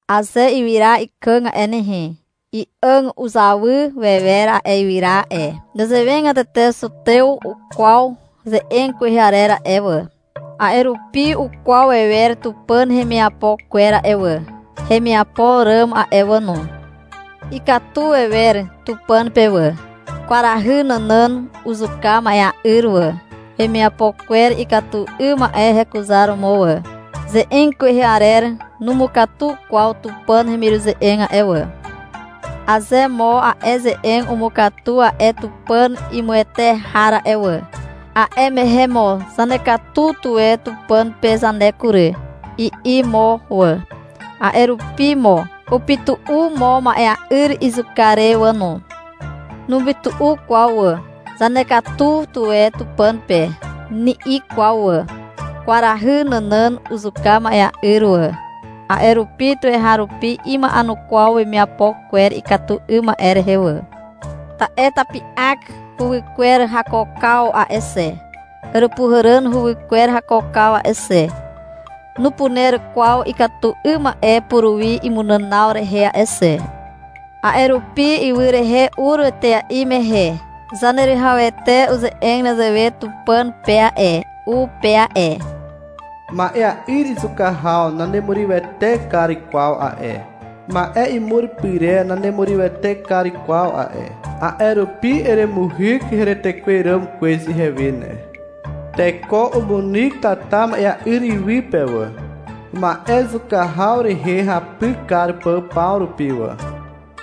Aze ywyra ikàg a'e nehe, i'àg uzawy wewer a'e ywyra a'e. Nezewegatete zutew ukwaw ze'eg kwehe arer a'e wà, a'e rupi ukwaw wewer Tupàn hemiapo kwer a'e wà, hemiapo ràm a'e wà no. Ikatu wewer Tupàn pe wà. Kwarahy nànàn uzuka ma'ea'yr wà, wemiapo kwer ikatu 'ym ma'e hekuzaromo wà. Ze'eg kwehe arer numukatu kwaw Tupàn hemiruze'eg a'e wà. Aze mo a'e ze'eg umukatu a'e Tupàn imuwete har a'e wà, a'e mehe mo — Zanekatu tuwe Tupàn pe zane kury, i'i mo wà. A'e rupi mo upytu'u mo ma'ea'yr izuka re wà no. Nupytu'u kwaw wà. — Zanekatu tuwe Tupàn pe, ni'i kwaw wà. Kwarahy nànàn uzuka ma'ea'yr wà. A'e rupi tuweharupi ima'enukwaw wemiapo kwer ikatu 'ym ma'e rehe wà. Ta'e tapi'ak huwykwer hakookaw a'e xe, Àràpuhàràn huwykwer hakookaw a'e xe, nupuner kwaw ikatu 'ym ma'e puruwi imunànaw rehe a'e xe. A'e rupi ywy rehe ur etea'i mehe Zaneruwihawete uze'eg nezewe Tupàn pe a'e, u pe a'e. — Ma'ea'yr izuka haw nanemurywete kar kwaw a'e. Ma'e imur pyrer nanemurywete kar kwaw a'e. A'e rupi eremuhyk heretekwer ràm kwez ihewe ne. Teko umunyk tata ma'ea'yr iwy pe wà, ma'e zuka haw rehe hapy kar pà paw rupi wà.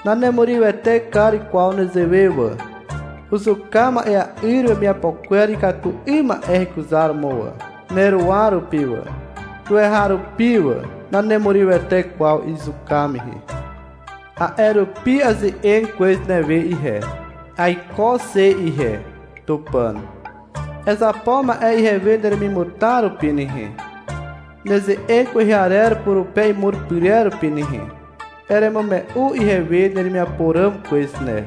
Nanemurywete kar kwaw nezewe wà. Uzuka ma'ea'yr wemiapo kwer ikatu 'ym ma'e hekuzaromo wà, neruwa rupi wà, tuweharupi wà. Nanerurywete kwaw izuka mehe. A'e rupi aze'eg kwez newe ihe. — Aiko xe ihe, Tupàn. Ezapo ma'e ihewe neremimutar rupi nehe, neze'eg kwehe arer purupe imur pyrer rupi ne. Eremume'u ihewe neremiapo ràm kwez ne.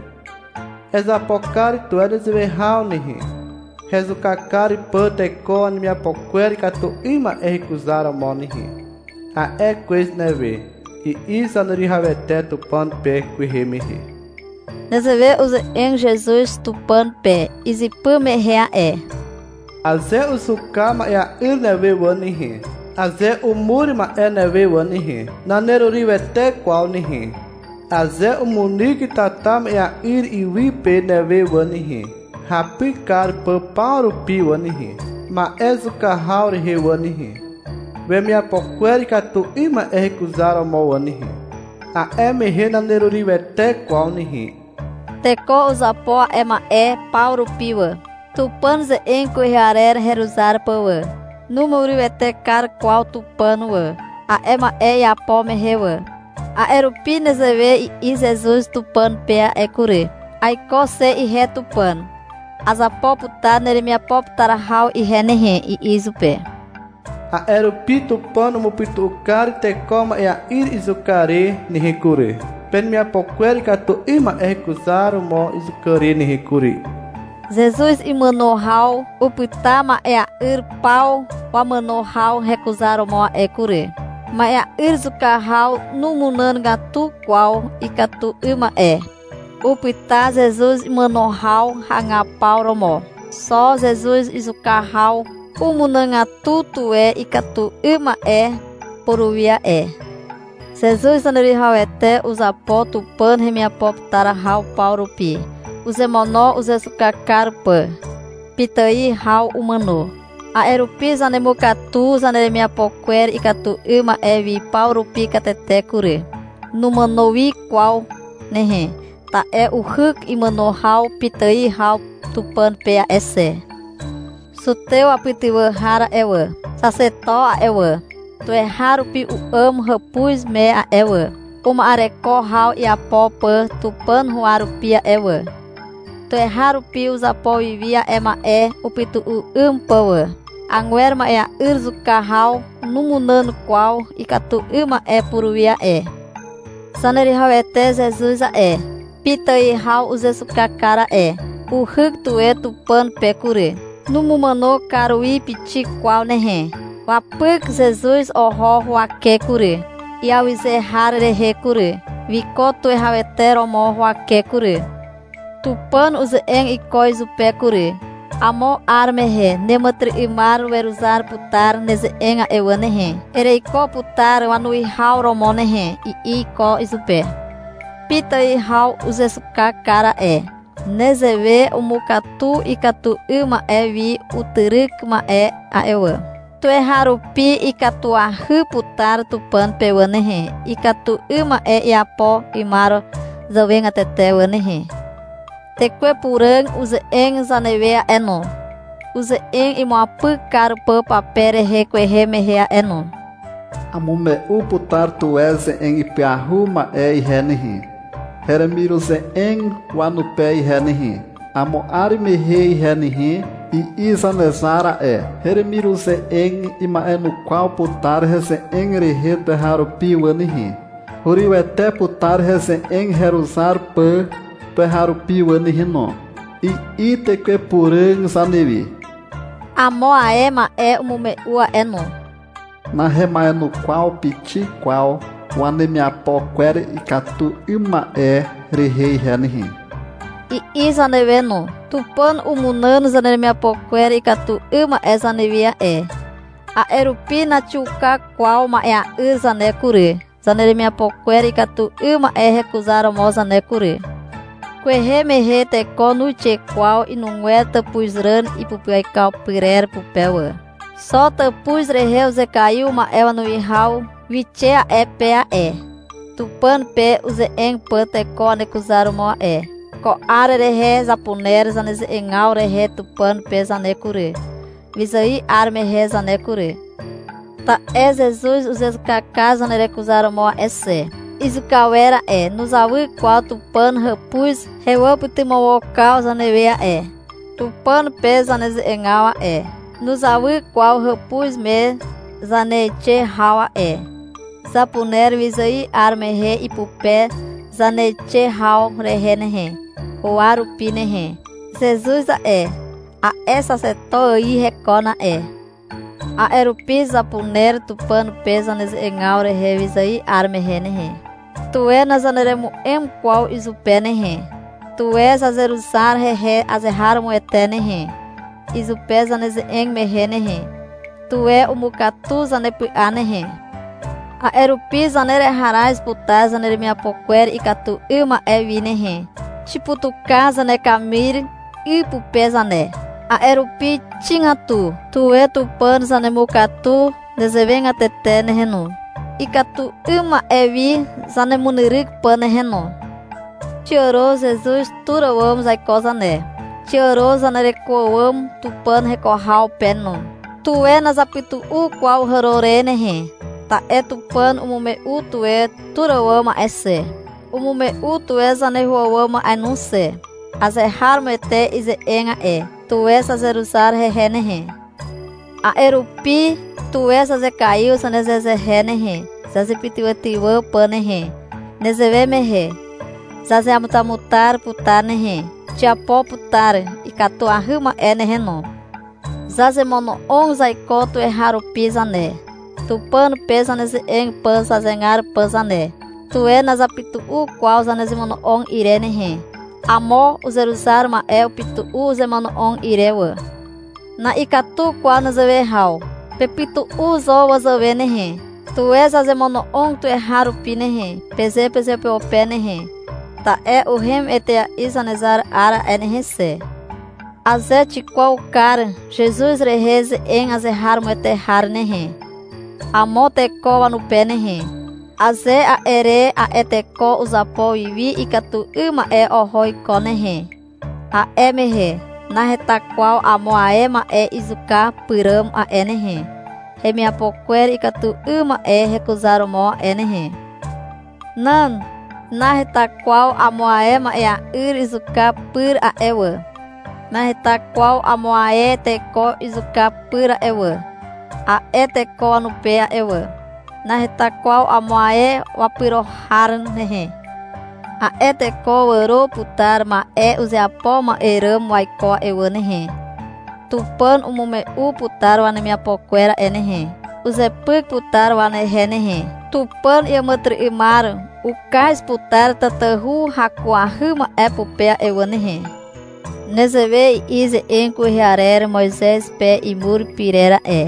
Ezapo kar tuwe nezewe haw nehe, hezuka kar pà teko wanemiapo kwer ikatu 'ym ma'e hekuzaromo nehe, a'e kwez newe, i'i Zaneruwihawete Tupàn pe kwehe mehe. Nezewe uze'eg Zezuz Tupàn pe izypy mehe a'e. — Aze uzuka ma'ea'yr newe wà nehe, aze umur ma'e newe wà nehe, nanerurywete kwaw nehe. Aze umunyk tata ma'ea'yr iwy pe newe wà nehe, hapy kar pà paw rupi wà nehe, ma'e zuka haw rehe wà nehe, wemiapo kwer ikatu 'ym ma'e hekuzaromo wà nehe, a'e mehe nanerurywete kwaw nehe, i'i izupe. Teko uzapo a'e ma'e paw rupi wà, Tupàn ze'eg kwehe arer heruzar pà wà. Numurywete kar kwaw Tupàn wà, a'e ma'e iapo mehe wà. A'e rupi nezewe i'i Zezuz Tupàn pe a'e kury. — Aiko xe ihe Tupàn, azapo putar neremiapo putar haw ihe nehe, i'i izupe. A'e rupi Tupàn umupytu'u kar teko ma'ea'yr izuka re nehe kury, penemiapo kwer ikatu 'ym ma'e hekuzaromo izuka re nehe kury, i'i purupe. Zezuz imàno haw upyta ma'ea'yr paw wamàno haw hekuzaromo a'e kury. Ma'ea'yr zuka haw numunàgatu kwaw ikatu 'ym ma'e. (Upyta Zezuz imàno haw hagapaw romo.) Xo Zezuz izuka haw umunàgatu tuwe ikatu 'ym ma'e puruwi a'e. Zezuz Zaneruwihawete uzapo Tupàn hemiapo putar haw paw rupi. Uzemono uzezuka kar pà. Pitài haw umàno. A'e rupi zanemukatu zaneremiapo kwer ikatu 'ym ma'e wi paw rupi katete kury. Numàno wi kwaw nehe, ta'e uhyk imàno haw pitài haw Tupàn pe a'e xe. Zutew wapytywà har a'e wà, Xaxeto a'e wà, tuweharupi u'àm hàpuz me a'e wà, uma'ereko haw iapo pà Tupàn huwa rupi a'e wà. Tuweharupi uzapo wi wi a'e ma'e upytu'u 'ym pà wà. Agwer ma'ea'yr zuka haw numunàn kwaw ikatu 'ym ma'e puruwi a'e. Zaneruwihawete Zezuz a'e, pitài haw uzezuka kar a'e. Uhyk tuwe Tupàn pe kury. Numumàno kar wi pixik kwaw nehe. Wapyk Zezuz oho huwake kury, iawyze har rehe kury. Wiko tuwihawete romo huwake kury. Tupàn uze'eg iko izupe kury. — Amo 'ar mehe neàmàtyry'ymar weruzar putar neze'eg a'e wà nehe, ereiko putar wanuwihaw romo nehe, i'i iko izupe. Pitài haw uzezuka kar a'e. Nezewe umukatu ikatu 'ym ma'e wi utyryk ma'e a'e wà. Tuweharupi ikatuahy putar Tupàn pe wà nehe, ikatu 'ym ma'e iapo 'ymar zàwegatete wà nehe. Tekwe Puràg uze'eg zanewe a'e no, uze'eg imuapyk kar pà pape rehe kwehe mehe a'e no. — Amume'u putar tuwe ze'eg ipyahu ma'e ihe nehe, heremiruze'eg wanupe ihe nehe, amo 'ar mehe ihe nehe, i'i Zanezar a'e. — Heremiruze'eg ima'enukwaw putar heze'eg rehe tuweharupi wà nehe. Hurywete putar heze'eg heruzar pà tuweharupi wà nehe no, i'i Tekwe Puràg zanewe. Amo ae ma'e umume'u a'e no. — Nahema'enukwaw pixik kwaw wanemiapo kwer ikatu 'ym ma'e rehe ihe nehe, i'i zanewe no. Tupàn umunàn zaneremiapo kwer ikatu 'ym ma'e zanewi a'e, a'e rupi naxiuka kwaw ma'ea'yr zane kury, zaneremiapo kwer ikatu 'ym ma'e hekuzaromo zane kury. Kwehe mehe teko nuixe kwaw inugwer tàpuzràn ipupyaikaw pyrer pupe wà. Xo tàpuz rehe uzekaiw ma'e wanuwihaw wixe a'e pe a'e, Tupàn pe uze'eg pà teko wanekuzaromo a'e. Ko 'ar rehe zapuner zaneze'egaw rehe Tupàn pe zane kury, wyzài 'ar mehe zane kury. Ta'e Zezuz uzezuka kar zanerekuzaromo a'e xe. Izuka awer a'e, nuzawy kwaw Tupàn hàpuz hewàpytymawokaw zanewe a'e. Tupàn pe zaneze'egaw a'e, nuzawy kwaw hàpuz me zaneixe haw a'e. Zapuner wyzài 'ar mehe ipupe zaneixe haw rehe nehe, huwa rupi nehe. Zezuz a'e, a'e xaxeto ài hekon a'e. A'e rupi zapuner Tupàn pe zaneze'egaw rehe wyzài 'ar mehe nehe. Tuwe nazaneremu'em kwaw izupe nehe. Tuwe zazeruzar hehe azeharomoete nehe, izupe zaneze'eg mehe nehe. Tuwe umukatu zanepy'a nehe. A'e rupi zanereharaz putar zaneremiapo kwer ikatu 'ym ma'e wi nehe. Xiputuka zanekamir 'y pupe zane. A'e rupi xigatu. Tuwe Tupàn zanemukatu nezewegatete nehe no, ikatu 'ym ma'e wi zanemunyryk pà nehe no. Xiàro Zezuz tur àwàm zaiko zane. Xiàro zanereko àwàm Tupàn heko haw pe no. Tuwe nazapytu'u kwaw hàro re nehe. Ta'e Tupàn umume'u tuwe tur àwàm a'e xe. Umume'u tuwe zaneho àwàm a'e no xe. Azeharomoete ize'eg a'e. Tuwe zazeruzar hehe nehe. A'e rupi, tuwe zazekaiw zanezehezehe nehe, zazepytywàtywà pà nehe. Nezewe mehe zazeamutamutar putar nehe. Xiapo putar ikatuahy ma'e nehe no. Zazemono'og zaiko tuweharupi zane, Tupàn pe zaneze'eg pà zanezegar pà zane. Tuwe nazapytu'u kwaw zanezemono'og ire nehe. Amo uzeruzar ma'e upytu'u uzemono'og ire wà. Na'ikatu kwaw nezewe haw. Pepytu'u zo wazàwe nehe. — Tuwe zazemono'og tuweharupi nehe, peze pezeupeupe nehe, ta'e uhem etea'i Zanezar 'ar a'e nehe xe. Aze xikwaw kar Zezuz rehe ze'eg azeharomoete har nehe, amo teko wanupe nehe, aze a'e re a'e teko uzapo wi wi ikatu 'ym ma'e oho iko nehe, a'e mehe naheta kwaw amo ae ma'e izuka pyràm a'e nehe, hemiapo kwer ikatu 'ym ma'e hekuzaromo a'e nehe. Nan. Naheta kwaw amo ae ma'ea'yr izuka pyr a'e wà, naheta kwaw amo ae teko izuka pyr a'e wà, a'e teko wanupe a'e wà. Naheta kwaw amo ae wapyro har nehe. A'e teko wàro putar ma'e uzeapo ma'e ràm waiko a'e wà nehe. Tupàn umume'u putar wanemiapo kwer a'e nehe. Uzepyk putar wanehe nehe. Tupàn iàmàtyry'ymar ukaz putar tatahu hakuahy ma'e pupe a'e wà nehe. Nezewe i'i ze'eg kwehe arer Moizez pe imur pyrer a'e.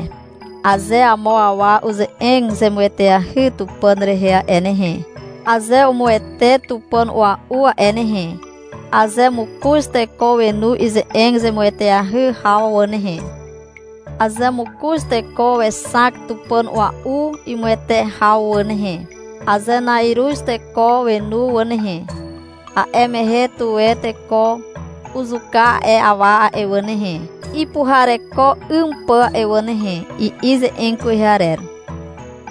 — Aze amo awa uze'eg zemueteahy Tupàn rehe a'e nehe, aze umuwete tupàn a'ua'u a'e nehe, aze mokoz teko wenu ize'eg zemueteahy haw wà nehe, aze mokoz teko wexak tupàn ua'u imuwete haw wà nehe, aze na'iruz teko wenu wà nehe, a'e mehe, tuwe teko uzuka a'e awa a'e wà nehe, ipuhareko 'ym pà a'e wà nehe, i'i ze'eg kwehe arer.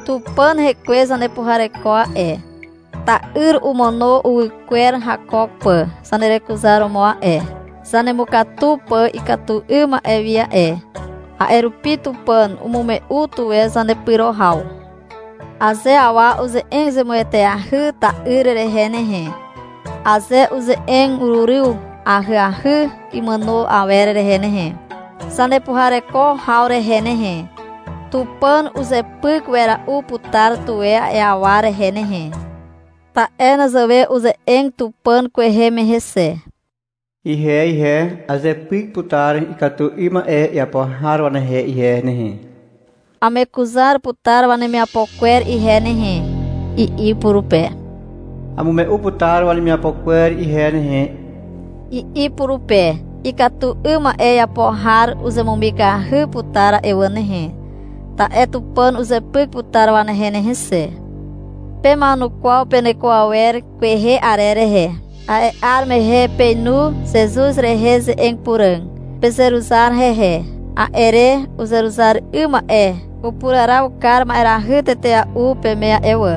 Tupàn Hekwe zanepuhareko a'e. Ta'yr umàno uwy kwer hakook pà zanerekuzaromo a'e, zanemukatu pà ikatu 'ym ma'e wi a'e. A'e rupi Tupàn umume'u tuwe zanepyro haw. Aze awa uze'eg zemueteahy ta'yr rehe nehe, aze uze'eg uryw ahyahy imàno awer rehe nehe, zanepuhareko haw rehe nehe, Tupàn uzepyk wera'u putar tuwe a'e awa rehe nehe. Ta'e nezewe uze'eg Tupàn kwehe mehe xe. — Ihe ihe, azepyk putar ikatu 'ym ma'e iapo har wanehe ihe nehe. Amekuzar putar wanemiapo kwer ihe nehe, i'i purupe. — Amume'u putar wanemiapo kwer ihe nehe, i'i purupe. Ikatu 'ym ma'e iapo har uzemumikahy putar a'e wà nehe, ta'e Tupàn uzepyk putar wanehe nehe xe. Pema'enukwaw peneko awer kwehe arer rehe. A'e 'ar mehe peinu Zezuz rehe ze'eg puràg. Pezeruzar hehe. A'e re uzeruzar 'ym ma'e upuraraw kar ma'erahy tetea'u peme a'e wà.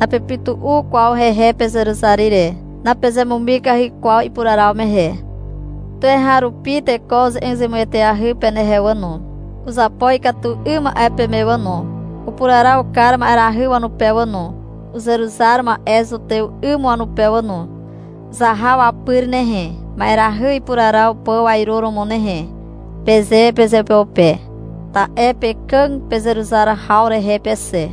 Napepytu'u kwaw hehe pezeruzar ire. Napezemumikahy kwaw ipuraraw mehe. Tuweharupi teko uze'eg zemueteahy penehe wà no. Uzapo ikatu 'ym ma'e peme wà no. Upuraraw kar ma'erahy wanupe wà no, uzeruzar ma'e zutew 'ym wanupe wà no. — Zaha wapyr nehe, ma'erahy ipuraraw pà wainuromo nehe, peze pezeupeupe. Ta'e pekàg pezeruzar haw rehe pe xe.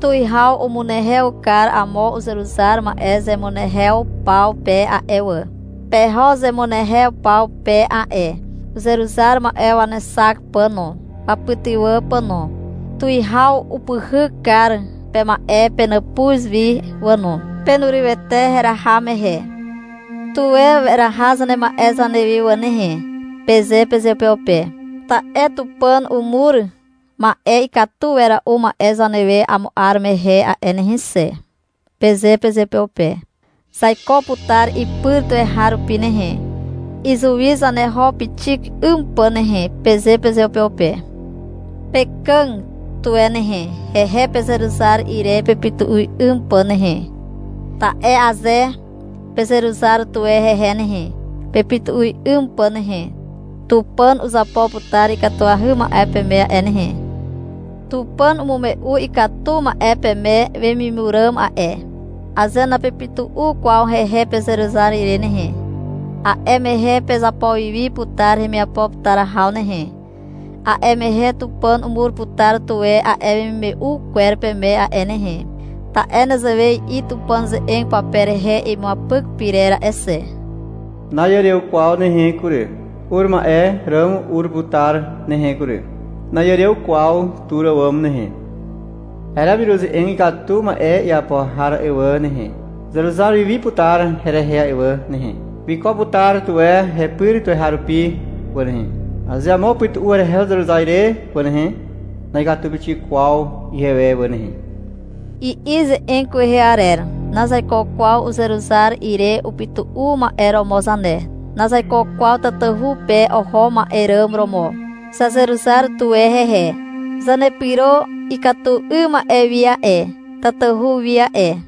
Tuwihaw umunehew kar amo uzeruzar ma'e zemunehew paw pe a'e wà. Peho zemunehew paw pe a'e uzeruzar ma'e wanexak pà no, wapytywà pà no. Tuwihaw upyhyk kar pema'e penàpuz wi wà no. Penurywete heraha mehe. — Tuwe weraha zanema'e zanewi wà nehe, peze pezeupeupe. — Ta'e Tupàn umur ma'e ikatu wera'u ma'e zanewe amo 'ar mehe a'e nehe xe, peze pezeupeupe. — Zaiko putar ipyr tuweharupi nehe, izuwi zaneho pixik 'ym pà nehe, peze pezeupeupe. Pekàg tuwe nehe, hehe pezeruzar ire pepytu'u 'ym pà nehe. Ta'e aze pezeruzar tuwe hehe nehe, pepytu'u 'ym pà nehe, Tupàn uzapo putar ikatuahy ma'e peme a'e nehe. Tupàn umume'u ikatu ma'e peme wemimur ràm a'e. Aze napepytu'u kwaw hehe pezeruzar ire nehe, a'e mehe pezapo wi wi putar hemiapo putar haw nehe. A'e mehe Tupàn umur putar tuwe a'e wemimume'u kwer peme a'e nehe. Ta'e nezewe i'i Tupàn ze'eg pape rehe imuapyk pyrer a'e xe. Na'iàrew kwaw nehe kury. Ur ma'e ràm ur putar nehe kury. Na'iàrew kwaw tur àwàm nehe. Heremiruze'eg ikatu ma'e iapo har a'e wà nehe, Uzeruzar wi wi putar herehe a'e wà nehe. Wiko putar tuwe hepyr tuweharupi wà nehe. Aze amo upytu'u herehe uzeruzar ire wà nehe, Na'ikatu pixik kwaw ihewe wà nehe, i'i ze'eg kwehe arer. Nazaiko kwaw uzeruzar ire upytu'u ma'e romo zane. Nazaiko kwaw tatahu pe oho ma'e ràm romo. Zazeruzar tuwe hehe. Zanepyro ikatu 'ym ma'e wi a'e, tatahu wi a'e.